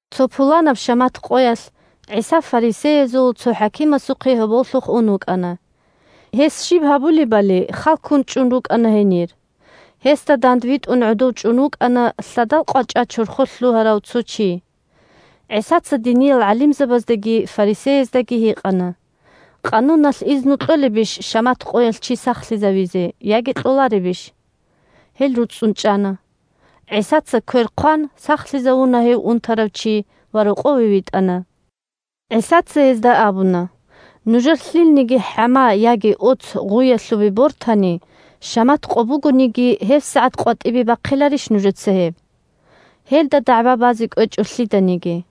Цо пуланаб шамат къоялъ ГӀиса фарисеязул цо хӀакимасухъе гьоболлъухъ ун вукӀана. Гьес щиб гьабулебали хал ккун чӀун рукӀана гьенир. Гьесда дандвитӀун гӀодов чӀун вукӀана лъадал къвачӀа чорхолъ лъугьарав цо чи. ГӀисаца диниял гӀалимзабаздаги фарисеяздаги гьикъана: – Къануналъ изну кьолебищ шамат къоялъ чи сахлъизавизе, яги кьоларебищ? Гьел руцӀцӀун чӀана. ГӀисаца квер хъван сахлъизавуна гьев унтарав чи ва рокъове витӀана. ГӀисаца гьезда абуна: – Нужер лъилниги хӀама яги оц гъуялъубе бортани, шамат къо бугониги, гьебсагӀат къватӀибе бахъиларищ нужеца гьеб? Гьелда дагӀба базе кӀвечӀо лъиданиги.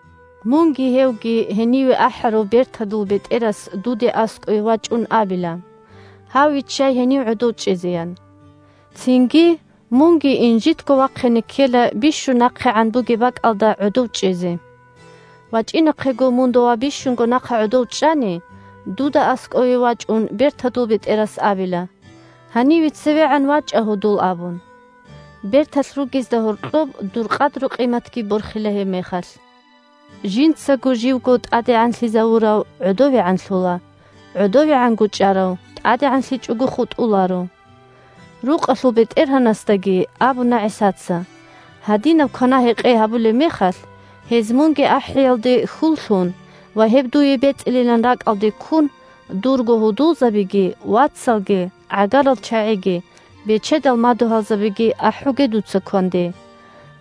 Мунги гьевги гьениве ахӀарав бертадул бетӀерас дуда аскӀове вачӀун, абила: «Гьав виччай гьенив гӀодов чӀезе», – ян. Цинги мунги инжитго вахъине ккела бищун нахъегӀан бугеб бакӀалда гӀодов чӀезе. ВачӀинахъего мун дова бищунго нахъа гӀодов чӀани, дуда аскӀове вачӀун бертадул бетӀерас абила: «Гьаниве цевегӀан вачӀа, гьудул», – абун. Берталъ ругезда гьоркьоб дур къадру-къиматги борхила гьебмехалъ. Жинцаго живго тӀадегӀанлъизавурав гӀодовегӀанлъула, гӀодовегӀанго чӀарав тӀадегӀанлъичӀого хутӀуларо. Рукъалъул бетӀергьанасдаги абуна ГӀисаца: – Гьадинаб квана-гьекъей гьабулеб мехалъ, гьез мунги ахӀиялде хьул лъун ва гьеб дуе бецӀилилан ракӀалде ккун, дурго гьудулзабиги, вацалги, гӀагарал чагӀиги, бечедал мадугьалзабиги ахӀуге дуца кванде.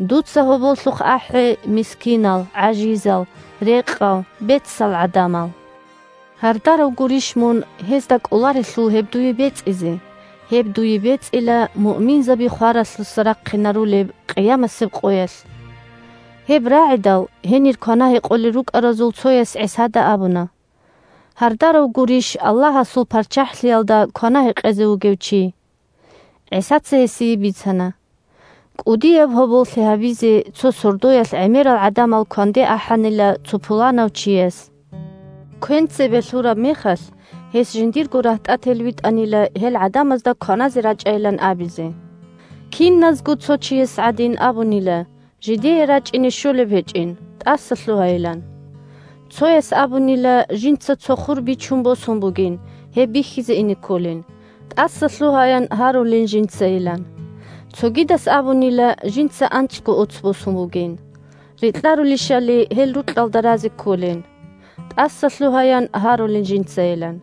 Дуца гьоболлъухъ ахӀе мискинал, гӀажизал, рекъал, бецал гӀадамал. Гьардарав гурищ мун, гьезда кӀоларелъул гьеб дуе бецӀизе. Гьеб дуе бецӀила муъминзаби хваралъуса рахъинарулеб къиямасеб къоялъ. Гьеб рагӀидал, гьенир квана-гьекъолел рукӀаразул цояс ГӀисада абуна: – Гьардарав гурищ Аллагьасул ПарччахӀлъиялда квана-гьекъезе вугев чи. ГӀисаца гьесие бицана: – КӀудияб гьоболлъи гьабизе цо сордоялъ гӀемерал гӀадамал кванде ахӀанила цо пуланав чияс. Квен цебе лъураб мехалъ, гьес жиндирго рагьтӀател витӀанила гьел гӀадамазда кваназе рачӀайилан абизе. Киназго цо чияс гӀадин абунила жидее рачӀине щолеб гьечӀин, тӀасалъугьайилан. Цояс абунила, жинца цо хур бичун босун бугин, гьеб бихьизе ине кколин, тӀасалъугьаян гьарулин жинцайилан. Цогидас абунила, жинца анцӀго оц босун бугин, рекьарулищали гьел рукьалда разе кколин, тӀасалъугьаян гьарулин жинцайилан.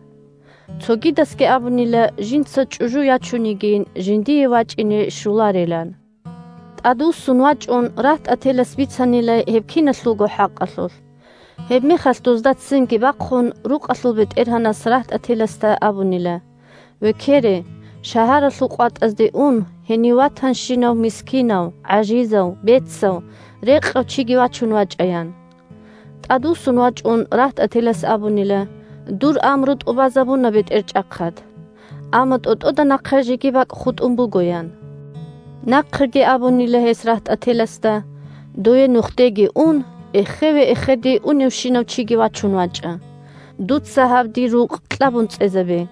Цогидасги абунила, жинца чӀужу ячун йигин, жиндие вачӀине щоларилан. ТӀадвуссун вачӀун, рагьтӀателас бицанила гьеб киналъулго хӀакъалъулъ. Гьебмехалъ, дозда ццинги бахъун, рукъалъул бетӀергьанас рагьтӀателасда абунила: «Векере, шагьаралъул къватӀазде ун, гьенив ватанщинав мискинав, гӀажизав, бецав, рекъав чиги вачӀун вачӀа», – ян. ТӀадвуссун вачӀун рагьтӀателас абунила: «Дур амру тӀубазабуна, бетӀерчӀахъад. Амма тӀотӀода нахъа жеги бакӀ хутӀун буго», – ян. Нахъеги абунила гьес рагьтӀателасда: «Дове нухде ун эхеве-эхеде уневщинав чиги вачун вачӀа. Дуца гьаб дир рукъ кьабун цӀезабе.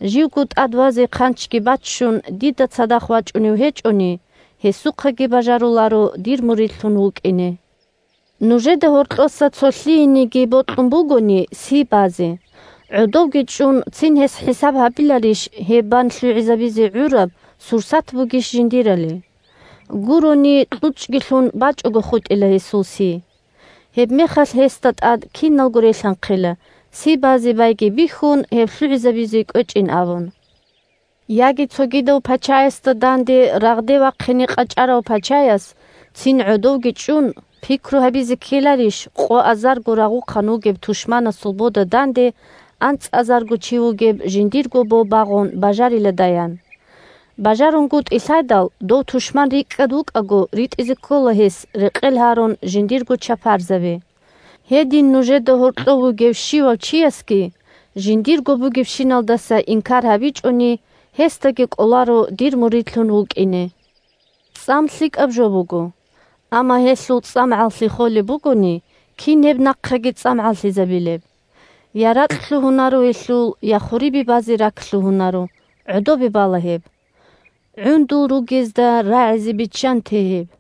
Живго тӀад вазе хъанчги баччун дида цадахъ вачӀунев гьечӀони, гьесухъаги бажаруларо дир муридлъун вукӀине. Нужеда гьоркьоса цо лъиениги бокьун бугони си базе, гӀодовги чӀун цин гьес хӀисаб гьабиларищ гьеб бан лъугӀизабизе гӀураб сурсат бугищ жиндирали. Гурони – кьучӀги лъун, бачӀого хутӀила гьесул си. Гьебмехалъ гьесда тӀад киналго релъанхъила, си базе байги бихьун, гьеб лъугӀизабизе кӀвечӀин абун. Яги цогидав пачаясда данде рагъде вахъине къачӀарав пачаяс, цин гӀодовги чӀун, пикру гьабизе ккеларищ къоазарго рагъухъан вугеб тушманасул бода данде анцӀазарго чи вугеб жиндир бо багъун бажариладаян. БажарунгутӀи лъайдал, дов тушман рикӀкӀад вукӀаго ритӀизе ккола гьес рекъел гьарун жиндирго чапарзаби. Гьедин нужеда гьоркьов вугев щивав чиясги жиндирго бугебщиналдаса инкар гьабичӀони, гьесдаги кӀоларо дир муридлъун вукӀине. ЦӀам лъикӀаб жо буго. Амма гьелъул цӀамгӀаллъи холеб бугони, кин гьеб нахъеги цӀамгӀаллъизабилеб? Я ракь лъугьунаро гьелъул, я хурибе базе рак лъугьунаро. ГӀодобе бала гьеб. ГӀундул ругезда рагӀизе биччанте гьеб!